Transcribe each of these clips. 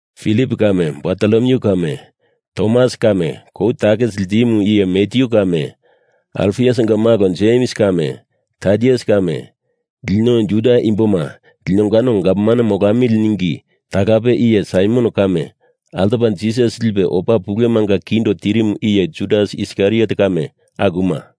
Filip kame Bartolomyu kame, Tomas kame kou takisi ltimu iye Matyu kame, Alfiusinga malo Jems kame, Tadius kame, Lino Juda imboma linongano gavman molamili ningi talape iye Saimon kame altopa Jisas lipe opa pulemanga kindo tirimu iye Judas Iskariot kame, akuma.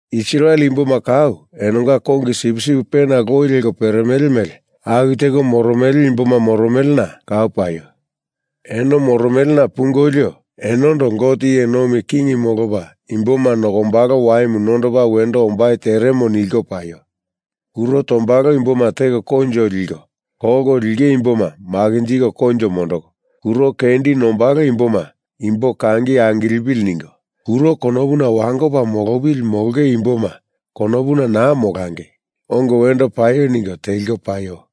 Israel imboma kau enonga kongi sipsip pena loi leko peremele mele aku teko moromele imboma moromelena kau paio. Eno moromelena pungolio, enondo Gote iye nomi king molopa imboma nokombalo waimu nondopa wendo ombai teremo nilko paio. Kuro tombalo imboma teko koinjo liko, kolko linge imboma makinjiko koinjo mondoko, kuro kendi nombalo imboma imbo kangi angilepili ningo, kuro konopuna wangopa molopili molonge imboma konopuna naa molangei, ongo wendo paio ningo teliko paio.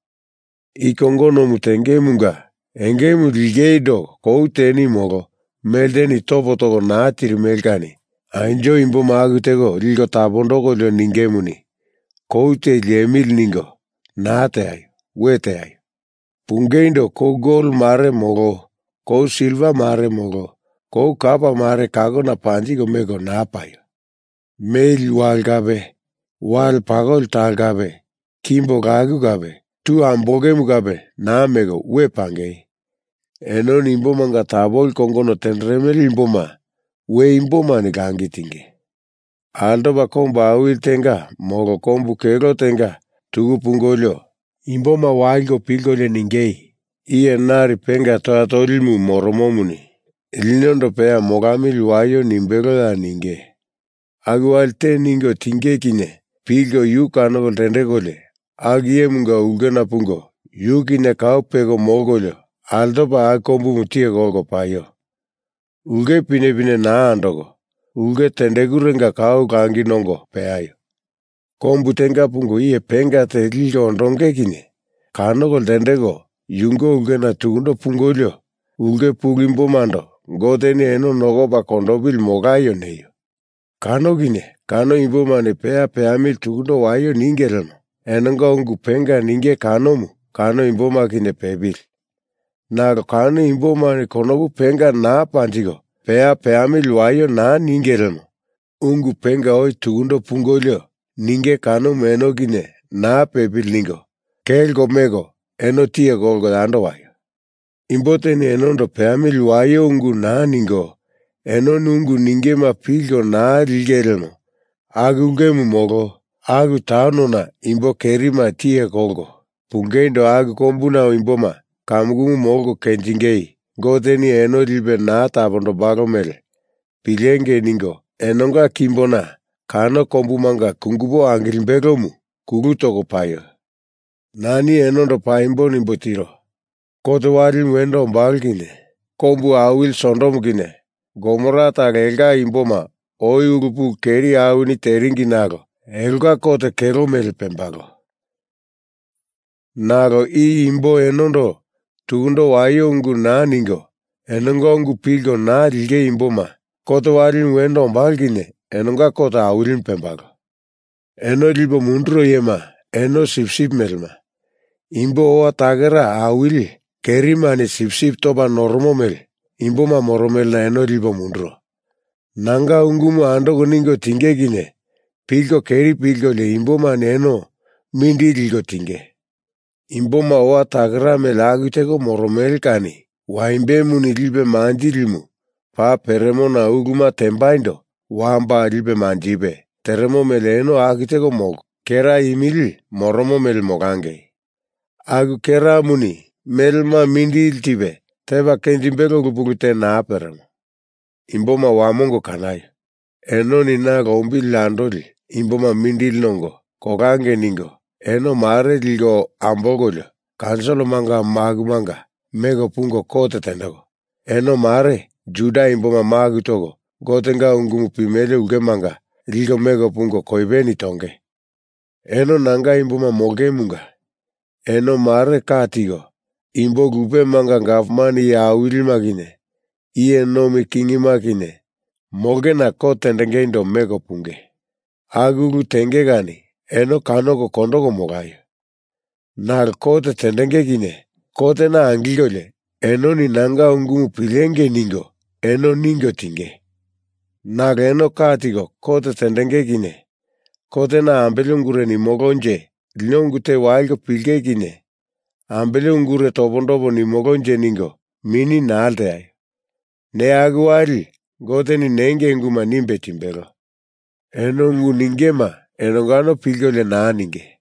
I kongonomu tengemunga engemu lingeindo kou teni molo melteni topo toko naa tirimele kani anjo imboma aku teko liko tapondokolio ningemuni, kou te liemili ningo naa teaio. We teaio. Pungeindo kou gol mare molo kou silva mare molo kou kapa mare kakona panjiko meko naa paio. Meli wale kape wale pakoli talo kape kimbo laku kape tu ambolongemu kape naa meko, we pangei. Enoni imbomanga tapoli kongono tenderemele imboma we imbomani langi tinge. Altopa kombu awili tenga molo kombu kelo tenga tuku pungolio, imboma waliko pilkolio ningei, iye nari penga toya tolimu moromomuni linondo peya molamili waio nimbeloya nenge. Aku wali te ningo tinge kinye pilko yu kanoko ltendekolio aku iyemunga ulkena pungo yu kinye kau peko molkolio altopa aku kombumu tiye kolko paio. Ulke pinepine naa andoko, ulke tendekurenga kau langi nongo peaio. Kombu tenga pungo iye penga te liko ondonge kinye kanoko ltendeko yunge ulkena tukundo pungolio, ulke pulu imbomando Goteni eno nokopa kondopili molaio neio. Kano kinye kano imbomani peya peamili tukundo waio ninge lemo, enonga ungu penga ninge kanomu kano imboma kinye pepili. Nalo kano imbomani konopu penga naa panjiko, peya peamili waio naa ninge lemo ungu penga oi tukundo pungolio ninge kanomu eno kinye naa pepili ningo, kelko meko eno tiye kolko yando waio. Imbo teni enondo peya peamili waio ungu naa ningo enoni ungu ningema pilko naa linge lemo aku ulkemu molo aku taunona imbo kerima tiye kolko pungeindo aku kombuna imboma kamukumu molko kenjingei Goteni eno lipe naa tapondombalo mele pilengei ningo enonga kimbona kano kombumanga kungupo angilimbelomu kulu toko paio. Nani eno paimbo nimbo tiro. Kot walimu wendo ombalo kinye kombu awili Sodom kinye Gomora talo elonga imboma oi ulu pulu keri awini teringi nalo elonga kot kelo mele pembalo. Nalo i imbo enondo tukundo waio ungu naa ningo enonga ungu pilko naa linge imboma kot walimu wendo ombalo kinye enonga kot awilimu pembalo. Eno lipo munduro iyema eno sipsip melema, imbo owa takera awili kerimani sipsip topa noromo mele imboma moromelena eno lipo munduro. Nanga ungumu andoko ningo tinge kinye pilko keri pilkolio imbomani eno mindili liko tinge. Imboma owa takera mele aku teko moromele kani waimbemu lipe manjilimu paa peremona uluma tembaindo wamba lipe manjipe teremo mele eno aku teko molko, kera imili moromo mele molangei. Aku keramuni melema mindili tipe tepa kenjimbelo ulu pulu te naa peremo. Imboma wamongo kanaio. Enoni na lombili andoli imboma mindili nongo, kolangei ningo, eno mare liko ambolkolio kaunsilimanga makumanga meko pungo kot tendeko, eno mare Juda imboma maku toko Gotenga ungumu pimele ulkemanga liko meko pungo koipeni tonge. Eno nanga imboma molongemunga eno mare ka tiko imbo lupemanga gavman iye awilima kinye iye nomi kingima kinye molongena kot tendengeindo meko punge. Aku ulu tenge kani eno kanoko kondoko molaio. Nalo kot tendenge kinye kotena angilkolio enoni nanga ungumu pilengei ningo eno ningo tinge. Nalo eno ka tiko kot tendenge kinye kotena ambele ungure nimolonje, lino ungu te waliko pilinge kinye ambele ungure topondopo nimolonje ningo mini naa lteaio. Neya aku wali Goteni nengei ungu nimbe timbelo. Eno ungu ningema enongano pilkolio naa ninge.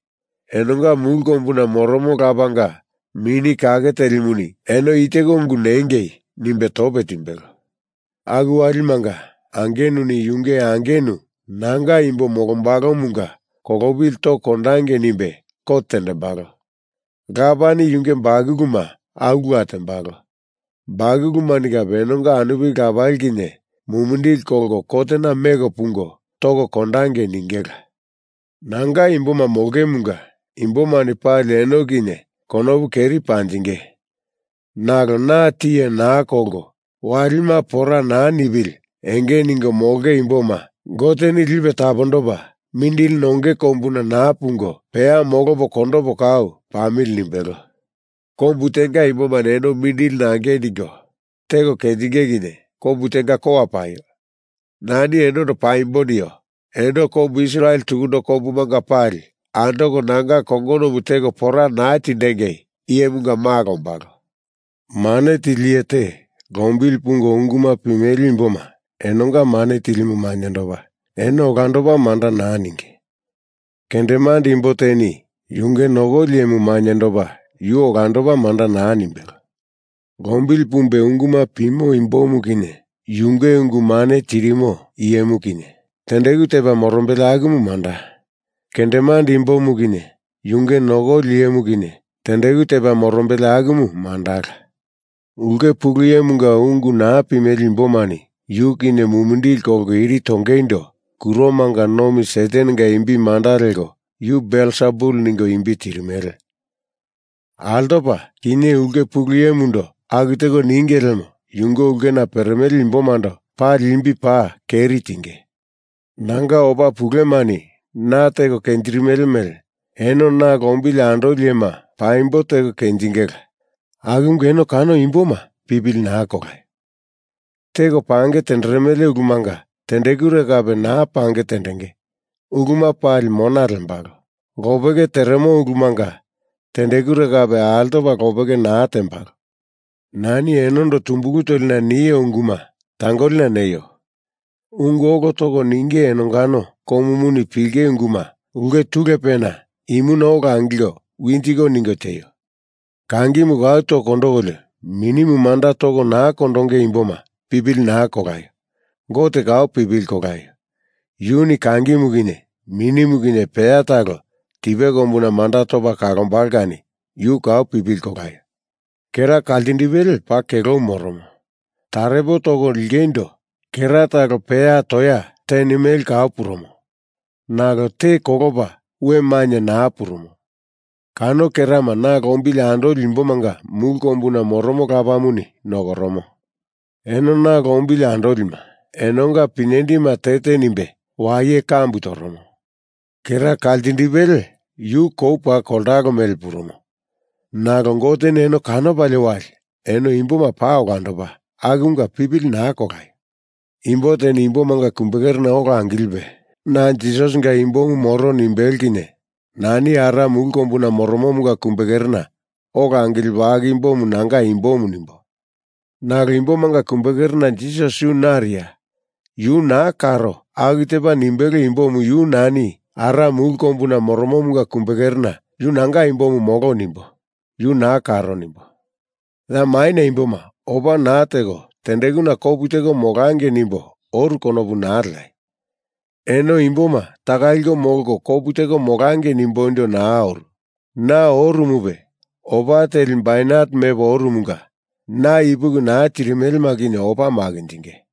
Enonga mulu kombuna moromo Lapanga Mini Kake Telimuni eno i teko ungu nengei nimbe tope timbelo. Aku walimanga angenuni yunge angenu nanga imbo molombalomunga kolopili toko kondangei nimbe kot tendembalo. Lapani yunge bakuluma akula tembalo. Bakulumani kape enonga anupili lapali kinye mumindili kolko kotena meko pungo toko kondangei ningela. Nanga imboma molongemunga imbomani pali eno kinye konopu keri panjinge, nalo na tiye naa kolko walima pora naa nipili enge ningo molonge imboma Goteni lipe tapondopa mindili nonge kombuna naa pungo peya molopo kondopo kau pamili nimbelo. Kombu tenga imbomani eno mindili nangei ningo teko kenjinge kinye kombu tenga kowa paio. Nani enondo paimbo nio. Eno kombu Israel tukundo kombumanga pali andoko nanga kongonomu teko pora naa tindengei Iyemunga Malo ombalo. Mane tili iye te lombili pungo unguma pimele imboma enonga mane tilimu mainyendopa, eno olandopa manda naa ninge. Kendemande imbo teni yunge nokoli iyemu mainyendopa, yu olandopa manda naa nimbelo. Lombili pumbe unguma pimo imbomu kinye yunge ungu mane tirimo iyemu kinye tendeku tepa morombele akumu manda. Kendemande imbomu kinye yunge nokoli iyemu kinye tendeku tepa morombele akumu mandala. Ulke pulu iyemunga ungu naa pimele imbomani yu kinye mumindili kolko iri tongeindo kuromanga nomi Satanenga imbi manda leko yu Belsebul ningo imbi tirimele. Altopa kinye ulke pulu iyemundo aku teko ninge lemo yunge ulkena peremele imbomando pali imbi paa keri tinge. Nanga opa pulemani na teko kenjirimele mele eno na lombili andoli iyema paimbo teko kenjingela akumunga eno kano imboma pipili naa kolaio. Teko pange tenderemele ulumanga tendekure kape naa pange tendenge, uluma pali mona lembalo. Lopeke teremo ulumanga tendekure kape altopa lopeke naa tembalo. Nani enondo tumbulu tolina nio unguma tangolina neio. Ungu olo toko ninge enongano komuni pilinge unguma ulke tulepena imuna ola angilko winjiko ningo tieio. Kangimu kau toko kondokolio minimu manda toko naa kondonge imboma pipili naa kolaio. Gote kau pipili kolaio. Yuni kangimu kinye minimu kinye peya talo tipe kombuna manda topa kondombalo kani yu kau pipili kolaio. Kera kaltindipele paa kelomu moromo, tarepo toko lingeindo kera talo peya toya teni mele kau purumo. Nalo te kolopa we mainye naa purumo. Kano kerama na lombili andoli imbomanga mulu kombuna moromo Lapamuni nokoromo. Eno na lombili andolima, enonga pinyendima te te nimbe waye kambu toromo. Kera kaltindipele yu kou paa koltalo mele purumo. Nalo Goteni eno kanopalie wali eno imboma paa olandopa. Akumunga pipili naa kolaio. Imbo teni imbomanga kumbekerena ola angilipe na Jisasinga imbomu moro nimbelo kinye nani Ara mulu kombuna moromomunga kumbekerena ola angilipo aku imbomu nanga imbomu nimbo. Nalo imbomanga kumbekerena Jisas yu nariya, Yu naa karo aku tepa nimbelo imbomu yu nani Ara mulu kombuna moromomunga kumbekerena yu nanga imbomu molo nimbo, yu naa karo nimbo. Ya maina imboma opa naa teko tendekuna kopu teko molangei nimbo oru konopu naa leaio. Eno imboma taka liko molko kopu teko molangei nimboindo naa oru. Na oromupe opa teli bainet mepo oromunga na ipuki naa tirimelema kinye opa makinjinge.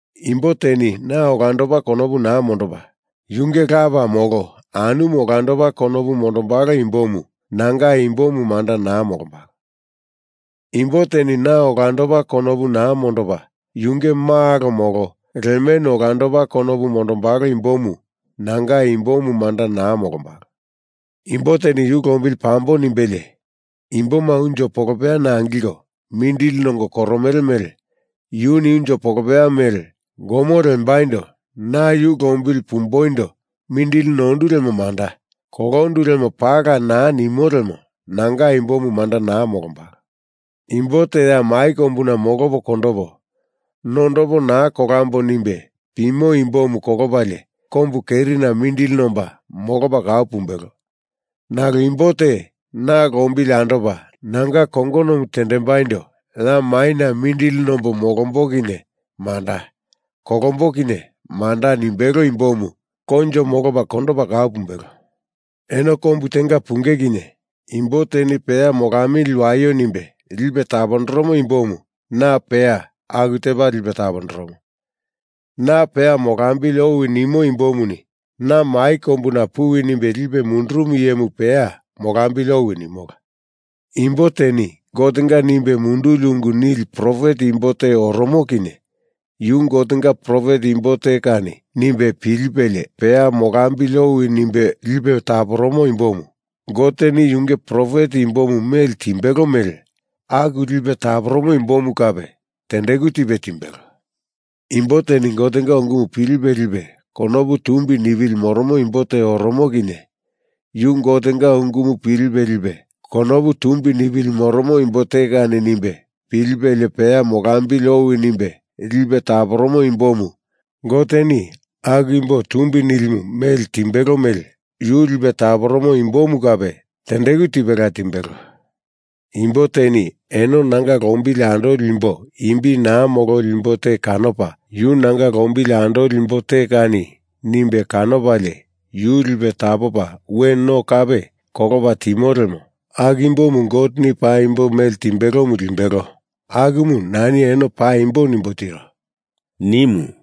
Imbo teni na olandopa konopu naa mondopa, yunge lapa molo anumu olandopa konopu mondombalo imbomu nanga imbomu manda naa molombalo. Imbo teni na olandopa konopu naa mondopa, yunge malo molo lemenu olandopa konopu mondombalo imbomu nanga imbomu manda naa molombalo. Imbo teni yu lombili pambo nimbelie imboma unjo polopeyana angilko mindili nongo koromele mele yuni unjo polopeya mele gomo lembaindo na yu lombili pumboindo mindili nondu lemo manda; kolondu lemo paala naa nimo lemo nanga imbomu manda naa molombalo. Imbo te ya mai kombuna na molopo kondopo, nondopo naa kolambo nimbe pimo imbomu kolopalie kombu kerina mindili nomba molopa kau pumbelo. Nalo imbo te na lombili andopa nanga kongonomu tendembaindo ya maina mindili nombo molombo kinye manda, kolombo kinye manda nimbelo imbomu koinjo molopa kondopa kau pumbelo. Eno kombu tenga punge kinye imbo teni peya molamili waio nimbe lipe tapondoromo imbomu na peya aku tepa lipe tapondoromo. Na peya molambili owi nimo imbomuni na mai kombuna puwi nimbe lipe mundurumu iyemu peya molambili owi nimola. Imbo teni Gotenga nimbe munduli ungu nili profet imbo te oromo kinye yu Gotenga profet imbo te kani nimbe pilipelie peya molambili owi nimbe lipe taporomo imbomu Goteni yunge profet imbomu mele timbelo mele aku lipe taporomo imbomu kape tendeku tipe timbelo. Imbo teni Gotenga ungumu pilipe lipe konopu tumbi nipili moromo imbo te oromo kinye yu Gotenga ungumu pilipe lipe konopu tumbi nipili moromo imbo te kani nimbe pilipelie peya molambili owi nimbe lipe taporomo imbomu Goteni aku imbo tumbi nilimu mele timbelo mele yu lipe taporomo imbomu kape tendeku tipela timbelo. Imbo teni eno nanga lombili andoli imbo imbi naa mololi imbo te kanopa yu nanga lombili andoli imbo te kani nimbe kanopalie yu lipe tapopa we no kape kolopa timo lemo aku imbomu Goteni paimbo mele timbelomu limbelo akumu nani eno paimbo nimbo tiro,” nimu.